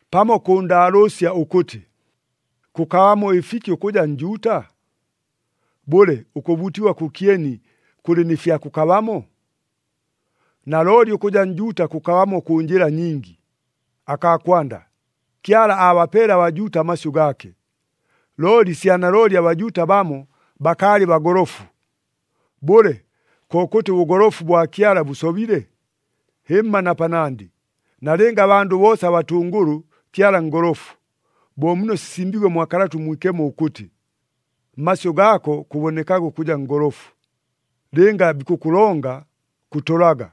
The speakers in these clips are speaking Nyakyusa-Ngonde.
Pamo kʉʉndaalʉʉsya ʉkʉtɨ, “Kʉkabamo ɨfiki ʉkʉja Njuuta? Bʉle, ʉkʉbuutigwa kʉkyeni kʉlɨ nɨ fya kʉkabamo?” Nalooli ʉkʉja Njuuta kʉkabamo kʉ njɨla nyingi. Akaa kwanda, Kyala aabapeele aBajuuta amasyʉ gaake. Looli sya nalooli aBajuuta bamo bakaalɨ bagolofu. Bʉle, kokʉtɨ ʉbʉgolofu bwa Kyala bʉsobile? Hɨmma na panandɨ! Nalɨnga abandʉ boosa batʉngʉlʉ, Kyala ngolofu. Bo muno sisimbiigwe mwa Kalata ʉMwikemo ʉkʉtɨ, “Mmasyʉ gaako kʉbonekaga ʉkʉja ngolofu, Lɨnga bikʉkʉlonga, kʉtolaga.”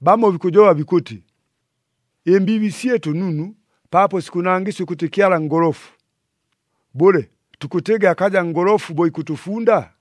Bamo bikʉjoba bikʉtɨ, “Ɨmbiibi syɨtʉ nunu paapo sikʉnangɨsya ʉkʉtɨ Kyala ngolofu.” Bʉle, tukʉtɨgɨ akaja ngolofu bo ikʉtʉfunda?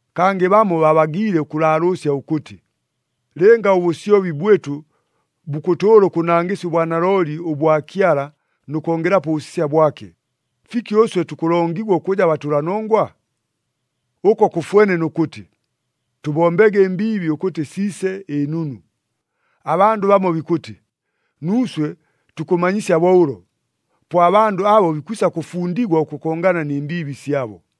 Kangɨ bamo babagiile ʉkʉlaalʉʉsya ʉkʉtɨ, “Lɨnga ʉbʉsyobi bwɨtʉ bukʉtʉʉla ʉkʉnangɨsya ʉbwanalooli ʉbwa Kyala nʉ kongelapo ʉbʉsisya bwake, fiki ʉswe tukʉlongigwa ʉkʉja batʉlanongwa?” Ʉko kʉfwene nʉ kʉtɨ, “Tʉbombege ɨmbiibi ʉkʉtɨ siise ɨnunu!” Abandʉ bamo bikʉtɨ, nuuswe tukʉmanyisya bo ʉlo. Po abandʉ abo bikwisa kʉfundigwa ʉkʉkongana nɨ mbiibi syabo.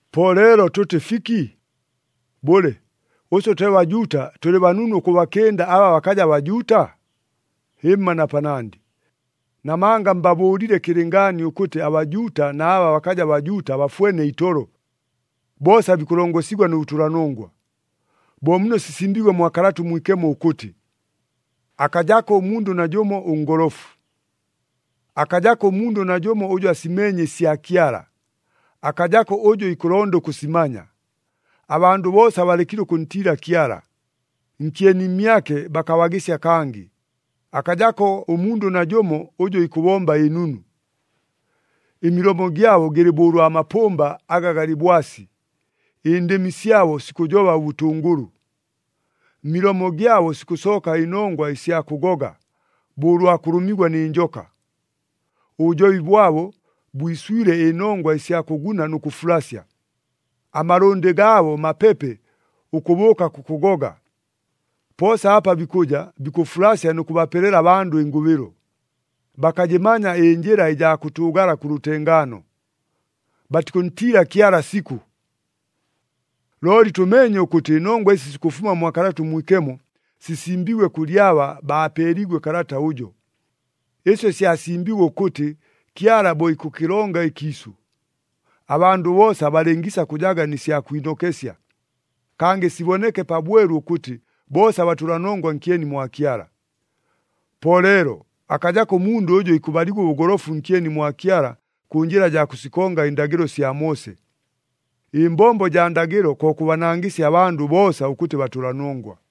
Po leelo tʉtɨ fiki? Bʉle, ʉswe twe Bajuuta tʉlɨ banunu ʉkʉbakɨnda aba bakaja Bajuuta? Hɨmma na panandɨ! Namanga mbabʉʉlile kɨlɨngaani ʉkʉtɨ aBajuuta na aba bakaja Bajuuta bafwene itolo, boosa bikʉlongosigwa nʉ bʉtʉlanongwa. Bo muno sisimbiigwe mwa Kalata ʉMwikemo ʉkʉtɨ, “Akajako ʉmundʉ najʉmo ʉngolofu. Akajako ʉmundʉ najʉmo ʉjʉ asimeenye ɨsya Kyala, akajako ʉjʉ ikʉlonda ʉkʉsimanya. Abandʉ boosa balekile ʉkʉntiila Kyala, nkyeni mmyake bakabagɨsya kangɨ. Akajako ʉmundʉ najʉmo ʉjʉ ikʉbomba ɨnunu.” “Ɨmilomo gyabo gɨlɨ bo ʉlwa mapʉmba aga galɨ bwasi, ɨndɨmi syabo sikʉjoba ʉbʉtʉngʉlʉ.” “Mmilomo gyabo sikʉsooka ɨnongwa ɨsya kʉgoga, bo ʉlwa kʉlʉmigwa nɨ njoka.” “Ʉbʉjobi bwabo, bwiswile ɨnongwa ɨsya kʉgʉna nʉ kʉfulasya.” “Amalʉndɨ gaabo mapepe ʉkʉbʉʉka kʉkʉgoga. Poosa apa bikʉja, bikʉfulasya nʉ kʉbapelela abandʉ ɨngʉbɨlo. Bakajɨmanya ɨnjɨla ɨjaa kʉtʉʉgala kʉ lʉtengaano.” “Batikʉntiila Kyala sikʉ.” Looli tʉmeenye ʉkʉtɨ ɨnongwa ɨsi sikʉfuma mwa Kalata ʉMwikemo, sisimbiigwe kʉlɨ aba baapeeliigwe kalata ʉjo. Ɨsyo syasimbiigwe ʉkʉtɨ Kyala bo ikʉkɨlonga ɨkiisʉ, abandʉ boosa balɨngiisa kʉjaga nɨ sya kwinokesya, kangɨ siboneke pabwelu ʉkʉtɨ boosa batʉlanongwa nkyeni mwa Kyala. Po leelo, akajako ʉmundʉ ʉjʉ ikʉbaligwa ʉbʉgolofu nkyeni mwa Kyala kʉ njɨla jaa kʉsikonga ɨndagɨlo sya Moose. Ɨmbombo jaa ndagɨlo ko kʉbanangɨsya abandʉ boosa ʉkʉtɨ batʉlanongwa.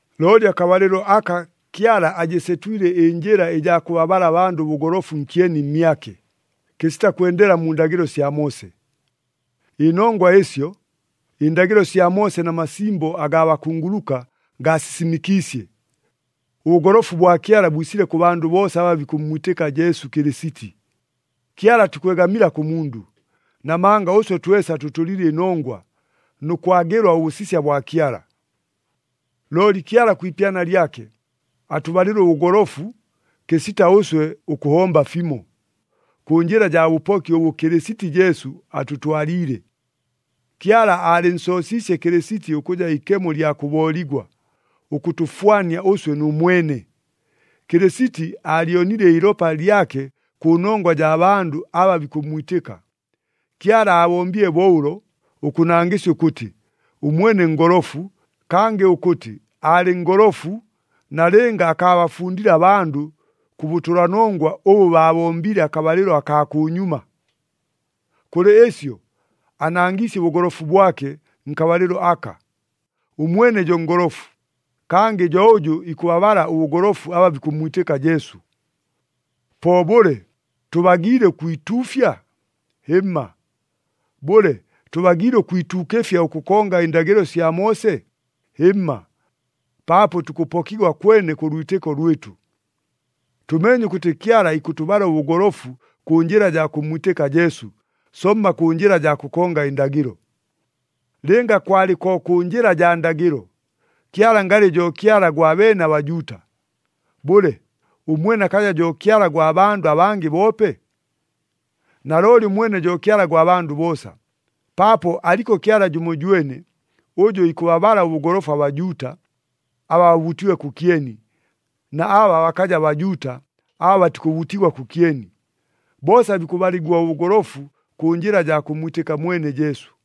Looli akabalɨlo aka Kyala ajɨsetwile ɨnjɨla ɨjaa kʉbabala abandʉ ʉbʉgolofu nkyeni mmyake, kɨsita kwendela mu ndagɨlo sya Moose. Ɨnongwa ɨsyo, ɨndagɨlo sya Moose na masimbo agaa bakunguluka gaasisimɨkiisye. Ʉbʉgolofu bwa Kyala bwisile kʉ bandʉ boosa aba bikʉmmwitɨka Jesu Kɨlɨsiti. Kyala atikwegamila kʉ mundʉ, namanga ʉswe twesa tʉtʉlile ɨnongwa, nʉ kwagɨlwa ʉbʉsisya bwa Kyala. Looli Kyala kwi ipyana lyake, atʉbalile ʉbʉgolofu kɨsita ʉswe ʉkʉhomba fimo, kʉ njɨla jaa bʉpoki ʉbʉ Kɨlɨsiti Jesu atʉtwaliile. Kyala aalɨnsoosiisye Kɨlɨsiti ʉkʉja ikemo ɨlya kʉbooligwa, ʉkʉtʉfwania ʉswe nʉ mwene. Kɨlɨsiti aalyonile iilopa lyake kʉ nongwa jaa bandʉ aba bikʉmmwitɨka. Kyala aabombile bo ʉlo, ʉkʉnangɨsya ʉkʉtɨ, ʉmwene ngolofu, kangɨ ʉkʉtɨ aalɨ ngolofu nalɨnga akaabafundile abandʉ kʉ bʉtʉlanongwa ʉbʉ baabombile akabalɨlo akaa kʉnyuma. Kʉlɨ ɨsyo, anangiisye ʉbʉgolofu bwake nkabalɨlo aka. Ʉmwene jo ngolofu, kangɨ jo ʉjʉ ikʉbabala ʉbʉgolofu aba bikʉmmwitɨka Jesu. Po bʉle, tʉbagiile ʉkwituufya? Hɨmma! Bʉle, tʉbagiile ʉkwituukɨfya ʉkʉkonga ɨndagɨlo sya Moose? Hɨmma! Paapo tukʉpokigwa kwene kʉ lwitɨko lwɨtʉ. Tʉmeenye ʉkʉtɨ Kyala ikʉtʉbala ʉbʉgolofu kʉ njɨla jaa kʉmmwitɨka Jesu, somma kʉ njɨla jaa kʉkonga ɨndagɨlo. Lɨnga kwalɨ ko kʉ njɨla jaa ndagɨlo, Kyala ngalɨ jo Kyala gwa beene aBajuuta. Bʉle, ʉmwene akaja jo Kyala gwa bandʉ abangɨ boope? Nalooli ʉmwene jo Kyala gwa bandʉ boosa, paapo aliko Kyala jʉmojwene, ʉjʉ ikʉbabala ʉbʉgolofu aBajuuta, aba babuutiigwe kʉkyeni, na aba bakaja Bajuuta, aba batikʉbuutigwa kʉkyeni. Boosa bikʉbaligwa ʉbʉgolofu kʉ njɨla jaa kʉmmwitɨka mwene Jesu.